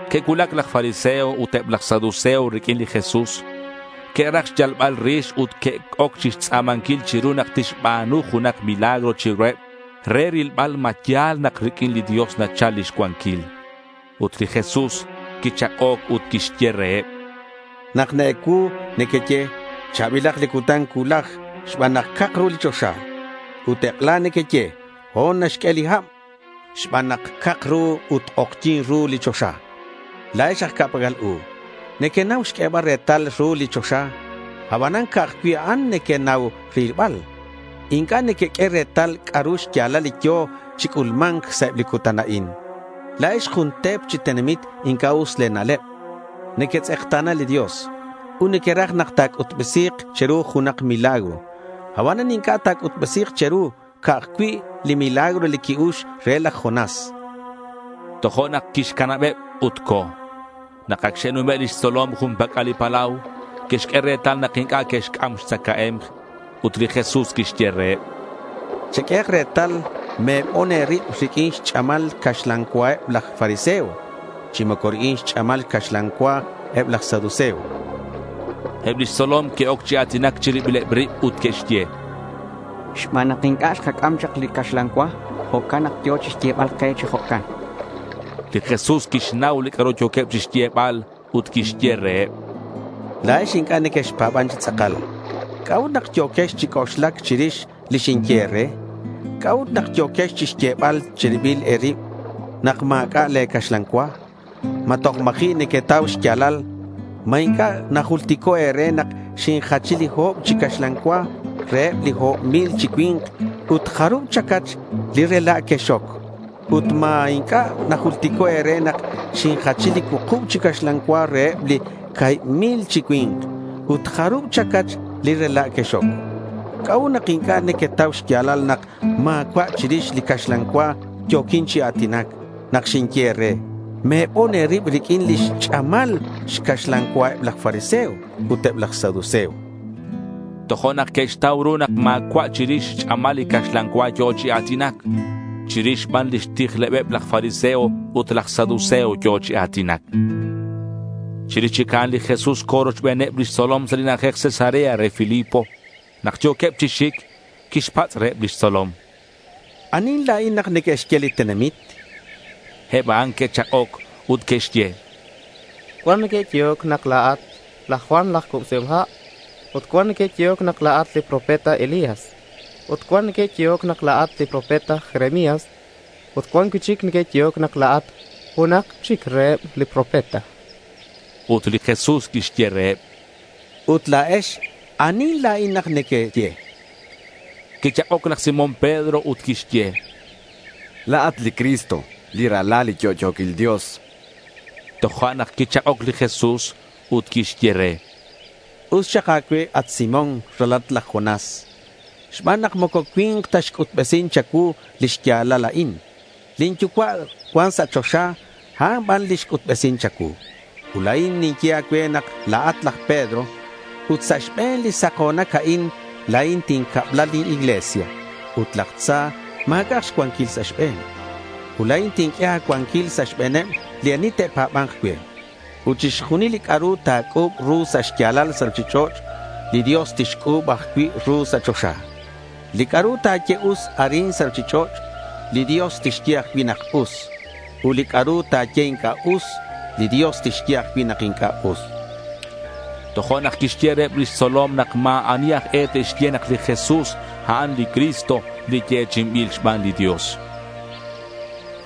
Que'cuulac laj fariseo ut eb laj saduceo riq'uin li Jesús. Que'raj xyalbal rix ut que'oc chixtz'a̱manquil chiru nak tixba̱nu junak milagro chiruheb re rilbal ma ya̱l nak riq'uin li Dios nachal lix cuanquil. Ut li Jesús quichak'oc ut quixye reheb: —Nak na-ecuu nequeye “cha̱bilak li cutan cuulaj xban nak cak ru li choxa.” Ut ek'ela nequeye “ho̱n naxq'ue hab xban nak cak ru ut k'ojyi̱n ru li choxa.” La̱ex aj ca'pac'al u. Nequenau xq'uebal retal ru li choxa. Abanan, ca'aj cui' a'an nequenau rilbal. Inc'a' nequeq'ue retal c'a'ru xya̱lal li yo̱ chi c'ulma̱nc sa' eb li cutan a'in. La̱ex jun te̱p chi tenamit inc'a' us le̱ na'leb. Nequetz'ekta̱na li Dios ut nequeraj nak ta̱c'utbesi̱k che̱ru junak milagro. Abanan inc'a' ta̱c'utbesi̱k che̱ru, ca'aj cui' li milagro li qui-ux re laj Jonás, chan li Jesús. Tojo'nak quixcanabeb ut co̱. Nak ac xe'nume' lix tzolom jun pac'al li palau, que'xq'ue retal nak inc'a' que'xc'am xtzacae̱mk. Ut li Jesús quixye reheb: —Cheq'uehak retal, me̱bon e̱rib riq'uin xch'amal xcaxlan cua eb laj fariseo chi moco riq'uin xch'amal xcaxlan cua eb laj saduceo. Eb lix tzolom que'oc chi a̱tinac chi ribileb rib ut que'xye: —Xban nak inc'a' xkac'am chak li caxlan cua, jo'can nak yo̱ chixyebal ke chi jo'can. Li Jesús quixnau li c'a'ru yo̱queb chixyebal ut quixye reheb: —La̱ex inc'a' nequexpa̱ban chi tz'akal. ¿C'a'ut nak yo̱quex chi c'oxlac chirix li xinye e̱re? ¿C'a'ut nak yo̱quex chixyebal chiribil e̱rib nak ma̱c'a' le̱ caxlan cua? ¿Ma toj ma̱ji' nequetau xya̱lal? ¿Ma inc'a' najultico' e̱re nak xinjachi li o̱b chi caxlan cua reheb li o̱b mil chi cui̱nk? Ut, ¿jarub chacach li rela' quexoc? chan. —Ut, ¿ma inc'a' najultico' e̱re nak xinjachi li cuukub chi caxlan cua reheb li ca̱hib mil chi cui̱nk? ut, ¿jarub chacach li rela' quexoc? ¿C'a'ut nak inc'a' nequetau xya̱lal nak ma̱cua' chirix li caxlan cua yo̱quin chi a̱tinac nak xinye e̱re: Me̱bon e̱rib riq'uin li xch'amal xcaxlan cua eb laj fariseo ut eb laj saduceo? chan. Tojo'nak que'xtau ru nak ma̱cua' chirix xch'amal lix caxlan cua yo̱ chi a̱tinac. Chirix ban lix tijlebeb laj fariseo ut laj saduceo yo̱ chi a̱tinac. Chirix chic a'an li Jesús co̱ rochbeneb lix tzolom sa' li na'ajej Cesarea re Filipo. Nak yo̱queb chi xic, quixpatz' reheb lix tzolom: —¿Anihin la̱in nak neque'xye li tenamit?— Eb a'an que'chak'oc ut que'xye: —Cuan neque'yehoc nak la̱at laj Juan laj Cubsihom Ha'. Ut cuan neque'yehoc nak la̱at li profeta Elías, ut cuan neque'yehoc nak la̱at li profeta Jeremías. Ut cuan cui'chic neque'yehoc nak la̱at junak chic reheb li profeta. Ut li Jesús quixye reheb: —Ut la̱ex, ¿Anihin la̱in nak nequeye?— Quichak'oc laj Simón Pedro ut quixye: —La̱at li Cristo, li Ralal li yo'yo̱quil Dios.— Tojo'nak quichak'oc li Jesús ut quixye re: —Us xak a̱cue, at Simón, ralalat laj Jonás, xban nak moco cui̱nk ta xc'utbesin cha̱cuu li xya̱lal a'in. Lin Yucua' cuan sa' choxa, a'an ban li xc'utbesin cha̱cuu. Ut la̱in ninye a̱cue nak la̱at laj Pedro. Ut sa' xbe̱n li sako̱nac a'in la̱in tincabla lin iglesia ut laj tza ma̱c'a'ak xcuanquil sa' xbe̱n. Ut la̱in tinq'ue a̱cuanquil sa' xbe̱neb li ani te'pa̱ba̱nk cue. Ut chixjunil li c'a'ru ta̱c'u̱b ru sa' xya̱lal sa' ruchich'och', li Dios tixc'u̱b ajcui' ru sa' choxa. Li c'a'ru ta̱ye us arin sa' ruchich'och', li Dios tixye ajcui' nak us. Ut li c'a'ru ta̱ye inc'a' us, li Dios tixye ajcui' nak inc'a' us. Tojo'nak quixye reheb lix tzolom nak ma̱ ani aj e te'xye nak li Jesús, a'an li Cristo, li yechi'inbil xban li Dios.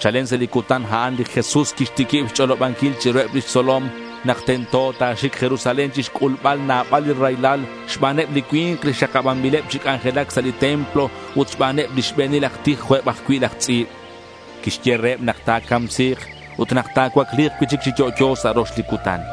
Chalen sa' li cutan a'an li Jesús quixtiquib xch'olobanquil chiruheb lix tzolom nak tento ta̱xic Jerusalén chixc'ulbal nabal li raylal xbaneb li cui̱nk li xakabanbileb chi c'anjelac sa' li templo ut xbaneb li xbe̱nil aj tij jo' eb ajcui' laj tz'i̱b. Quixye reheb nak ta̱camsi̱k ut nak ta̱cuacli̱k cui'chic chi yo'yo sa' rox li cutan.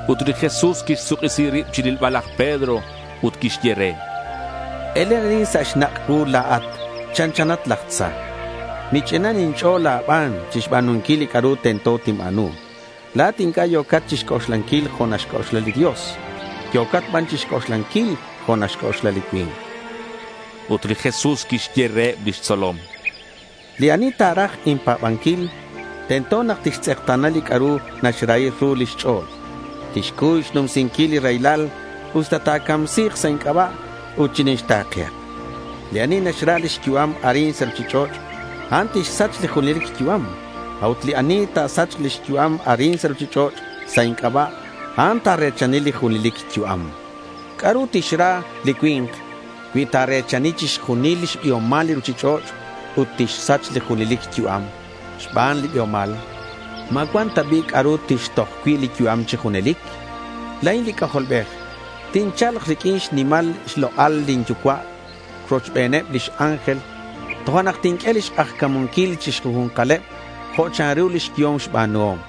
Ut li Jesús quixsuk'isi rib chirilbal laj Pedro ut quixye re: —Elen arin sa' xnak' cuu. La̱at chanchanat laj tza. Mich'inan inch'o̱l a̱ban chixba̱nunquil li c'a'ru tento tinba̱nu. La̱at inc'a' yo̱cat chixc'oxlanquil jo' naxc'oxla li Dios. Yo̱cat ban chixc'oxlanquil jo' naxc'oxla li cui̱nk, chan. Ut li Jesús quixye reheb lix tzolom: —Li ani ta̱raj inpa̱banquil, tento nak tixtz'ekta̱na li c'a'ru naxrahi ru lix ch'o̱l. Tixcuy xnumsinquil li raylal, usta ta̱camsi̱k sa' inc'aba'. Ut chinixta̱kehak. Li ani naxra lix yu'am arin sa' ruchich'och', a'an tixsach li junelic yu'am. A'ut li ani naxsach lix yu'am arin sa' ruchich'och' sa' inc'aba', a'an ta̱re̱chani li junelic yu'am. ¿C'a'ru tixra li cui̱nk cui ta̱re̱chani chixjunil xbiomal li ruchich'och' ut tixsach li junelic yu'am xban li biomal? ¿Ma cuan ta bi' c'a'ru tixtoj cui' li yu'am chi junelic? La̱in li C'ajolbej tincha̱lk riq'uin xnimal xlok'al lin Yucua' cuochbeneb lix ángel. Tojo'nak tinq'ue lix k'ajca̱munquil chi xjunju̱nkaleb jo' chanru lix yehom xba̱nuhom.